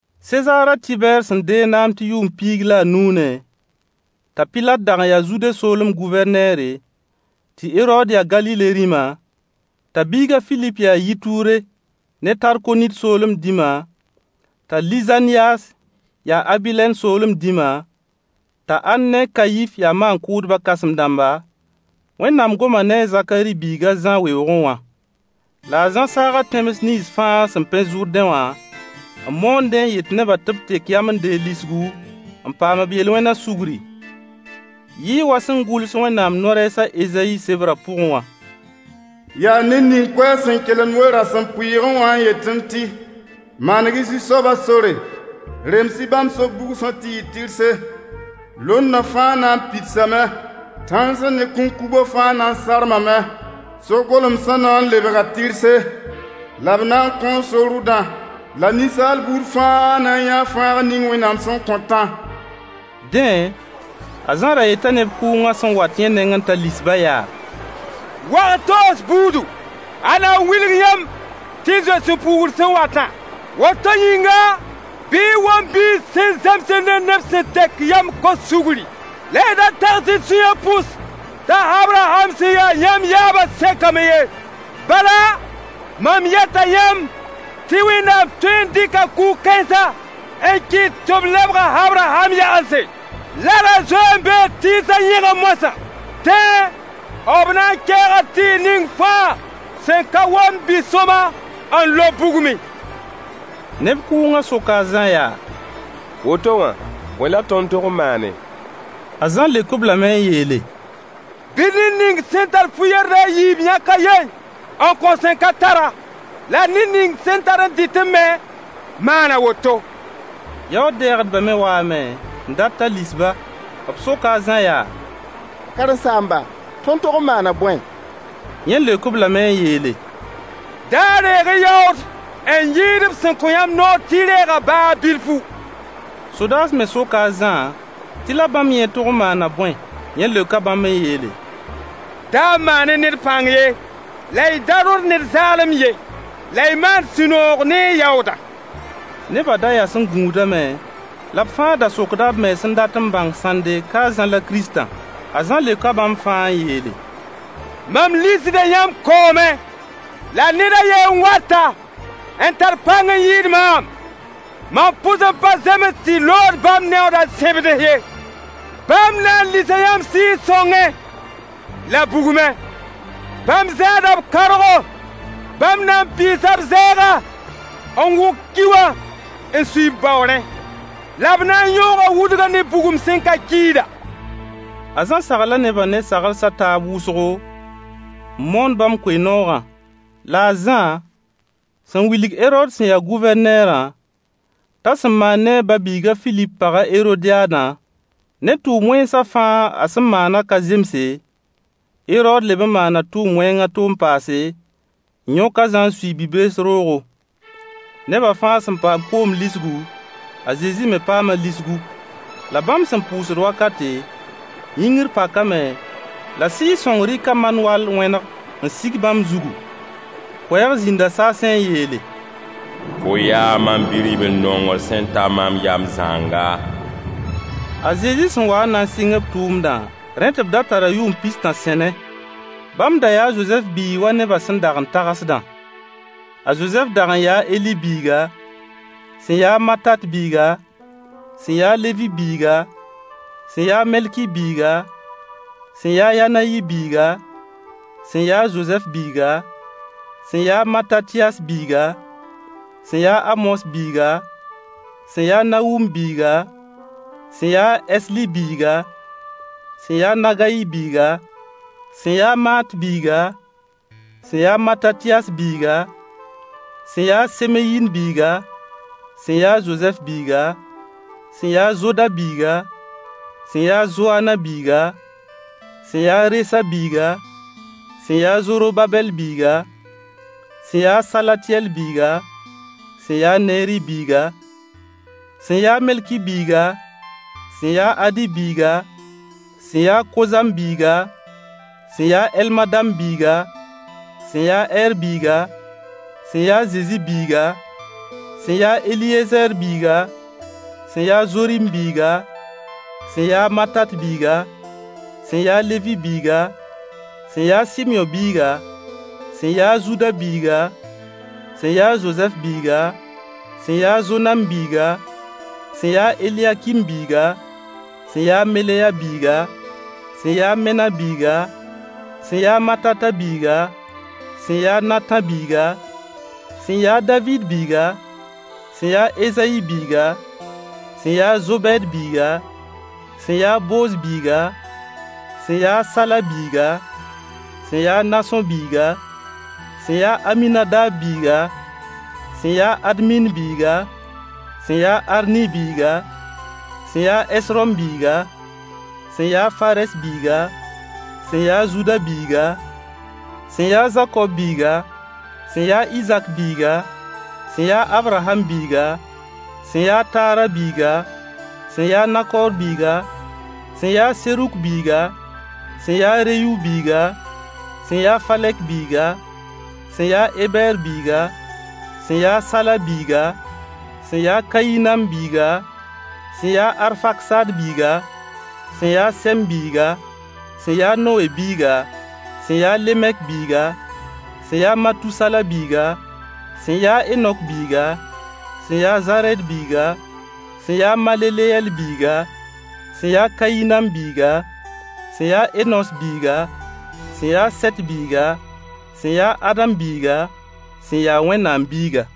Sezaar a Tɩbɛɛr sẽn deeg naam tɩ yʋʋm piig la nuunẽ, t'a Pilat dag n yaa Zude soolem Gʋvɛrneere, tɩ Herood ya Galile rĩma, t'a biig a Filip ya Yituure ne Tarkonit soolem dĩma, t'a Lizanyaas ya Abilɛn soolem dĩma, t'a Ann ne a Kayif ya maan-kʋʋdbã kãsem-dãmba, Wẽnnaam goma ne a Zakari biig a Zã weoogẽ wã. La a Zã saaga tẽms nins fãa sẽn pẽ Zʋrdẽ wã, n moondẽ n yet nebã tɩ b tek yam n deeg lisgu, n paam b yel-wẽnã sugri. Yɩɩ wa sẽn gʋls Wẽnnaam no-rɛɛs a Ezayi sebrã pʋgẽ wã: Yaa ned ning koɛɛg sẽn kelemd we-rasempʋɩɩgẽ wã, n yetẽ tɩ: Maneg-y Zu-soabã sore! Rems-y bãmb so-bugsã tɩ yɩ tɩrse! Londã fãa na n pidsame! Tãensã ne kũnkubã fãa na n sarmame! So-golemsã na n lebga tɩrse, la b na n kõo so-rʋdã! La ninsaal buud fãa na n yãa fãagr ning Wẽnnaam sẽn kõtã. Dẽ, a Zã ra yeta neb kʋʋngã sẽn wat yẽ nengẽ t'a lis-bã yaa: Wag-toos buudu, ãnna n wilg yãmb tɩ y zoe sũ-puugr sẽn watã? Woto yĩnga, bɩ y wom biis sẽn zemsd ne neb sẽn tek yam n kos sugri, la y da tags y sũyã pʋs t'a Abraham sẽn ya yãmb yaabã sekame ye. Bala, mam yeta yãmb tɩ Wẽnnaam tõe n dɩka kug-kãensã n kɩt tɩ b lebg a Abraham yagense. Larã zoe n bee tɩɩsã yẽgẽ moasã. Dẽ, b na n keega tɩɩg ning fãa sẽn ka womd bi-sõama, n lob bugmẽ. Neb kʋʋngã soka a Zã yaa: Woto wã, bõe la tõnd tog n maane? A Zã leok-b lame n yeele: Bɩ ned ning sẽn tar fu-yerdɩ a yiib yãk a ye n kõ sẽn ka tar-a, la ned ning sẽn tar n dɩtẽ me maan a woto. Yaood-dɛɛgdbã me waame n dat t'a lis-ba. B soka a Zã yaa: Karen-saamba, tõnd tog n maana bõe? Yẽ leok-b lame n yeele: Da reeg-y yaood n yɩɩd b sẽn kõ yãmb noor tɩ y reegã baa bilfu. Sodaas me soka a Zã tɩ la bãmb yẽ tog n maana bõe? Yẽ leoka bãmb n yeele: Da maan-y ned pãng ye, la y da rõd neb zaalem ye, la y maan sũ-noog ne y yaoodã. Nebã da yas n gũudame, la b fãa da sokda b mens n dat n bãng sãnde ka a Zã la Kiristã. A Zã leoka bãmb fãa n yeele: Mam lisda yãmb koomẽ. La ned a ye n wata, n tar pãng n yɩɩd maam. Mam pʋs n pa zems tɩ lood bãmb neooda sẽbds ye. Bãmb na n lisa yãmb Sɩɩg-sõngẽ la bugmẽ. Bãmb zãada b kãoorgo. Bãmb na n pɩɩsa b zɛɛga, n wʋk ki wã n sui b baoorẽ. La b na n yõoga wudgã ne bugum sẽn ka kiida. A Zã sagla nebã ne sagls a taab wʋsgo, n moon bãmb koe-noogã. La a Zã sẽn wilg Herood sẽn ya Gʋvɛrneerã t'a sẽn maan ne a ba-biig a Filip pag Herodyaadã, ne tʋʋm wẽnsã fãa a sẽn maanã ka zemse, Herood leb n maana tʋʋm wẽng a to n paase, n yõk a Zã n sui bi-bees roogo. Neba fãa sẽn paam koom lisgu, a Zezi me paama lisgu. La bãmb sẽn pʋʋsd wakate, yĩngr pakame, la Sɩɩg-sõng rɩka man-wall wẽneg n sig bãmb zugu. Koɛɛg zĩnda saasẽ n yeele: Fo yaa mam bi-ribl-nongr sẽn ta mam yam zãnga. A Zezi sẽn wa n na n sɩng b tʋʋmdã, rẽ tɩ b da tara yʋʋm pis-tã sẽne. Bãmb da yaa a Zozɛf biig wa nebã sẽn dag n tagsdã. A Zozɛf dag n yaa a Heli biiga, sẽn yaa a Matat biiga, sẽn yaa a Levi biiga, sẽn yaa a Melki biiga, sẽn yaa a Yanayi biiga, sẽn yaa a Zozɛf biiga, sẽn yaa a Matatyas biiga, sẽn yaa a Amos biiga, sẽn yaa a Nahum biiga, sẽn yaa a Esli biiga, sẽn yaa a Nagayi biiga, sẽn yaa a Maat biiga, sẽn yaa a Matatyas biiga, sẽn yaa a Semeyin biiga, sẽn yaa a Zozɛf biiga, sẽn yaa a Zoda biiga, sẽn yaa a Zoaana biiga, sẽn yaa a Resa biiga, sẽn yaa a Zorobabɛll biiga, sẽn yaa a Salatyɛl biiga, sẽn yaa a Neeri biiga, sẽn yaa a Melki biiga, sẽn yaa a Adi biiga, sẽn yaa a Kozam biiga, sẽn yaa a Elmadam biiga, sẽn yaa a Ɛɛr biiga, sẽn yaa a Zezi biiga, sẽn yaa a Eliyezɛɛr biiga, sẽn yaa a Zorim biiga, sẽn yaa a Matat biiga, sẽn yaa a Levi biiga, sẽn yaa a Sɩmyõ biiga, sẽn yaa a Zuda biiga, sẽn yaa a Zozɛf biiga, sẽn yaa a Zonam biiga, sẽn yaa a Eliyakim biiga, sẽn yaa a Meleya biiga, sẽn yaa a Mena biiga, sẽn yaa a Matata biiga, sẽn yaa a Natã biiga, sẽn yaa a Daviid biiga, sẽn yaa a Ezayi biiga, sẽn yaa a Zobɛɛd biiga, sẽn yaa a Booz biiga, sẽn yaa a Sala biiga, sẽn yaa a Nasõ biiga, sẽn yaa a Aminadab biiga, sẽn yaa a Admin biiga, sẽn yaa a Arni biiga, sẽn yaa a Ɛsrom biiga, sẽn yaa a Farɛs biiga, sẽn yaa a Zuda biiga, sẽn yaa a Zakob biiga, sẽn yaa a Izak biiga, sẽn yaa a Abraham biiga, sẽn yaa a Taara biiga, sẽn yaa a Nakoor biiga, sẽn yaa a Seruk biiga, sẽn yaa a Reyu biiga, sẽn yaa a Falɛk biiga, sẽn yaa a Ebɛɛr biiga, sẽn yaa a Sala biiga, sẽn yaa a Kayinam biiga, sẽn yaa a Arfaksaad biiga, sẽn yaa a Sɛm biiga, sẽn yaa a Nowe biiga, sẽn yaa a Lemek biiga, sẽn yaa a Matusala biiga, sẽn yaa a Henok biiga, sẽn yaa a Zarɛd biiga, sẽn yaa a Maleleyɛl biiga, sẽn yaa a Kayinam biiga, sẽn yaa a Enos biiga, sẽn yaa a Sɛt biiga, sẽn yaa a Adam biiga, sẽn ya Wẽnnaam biiga.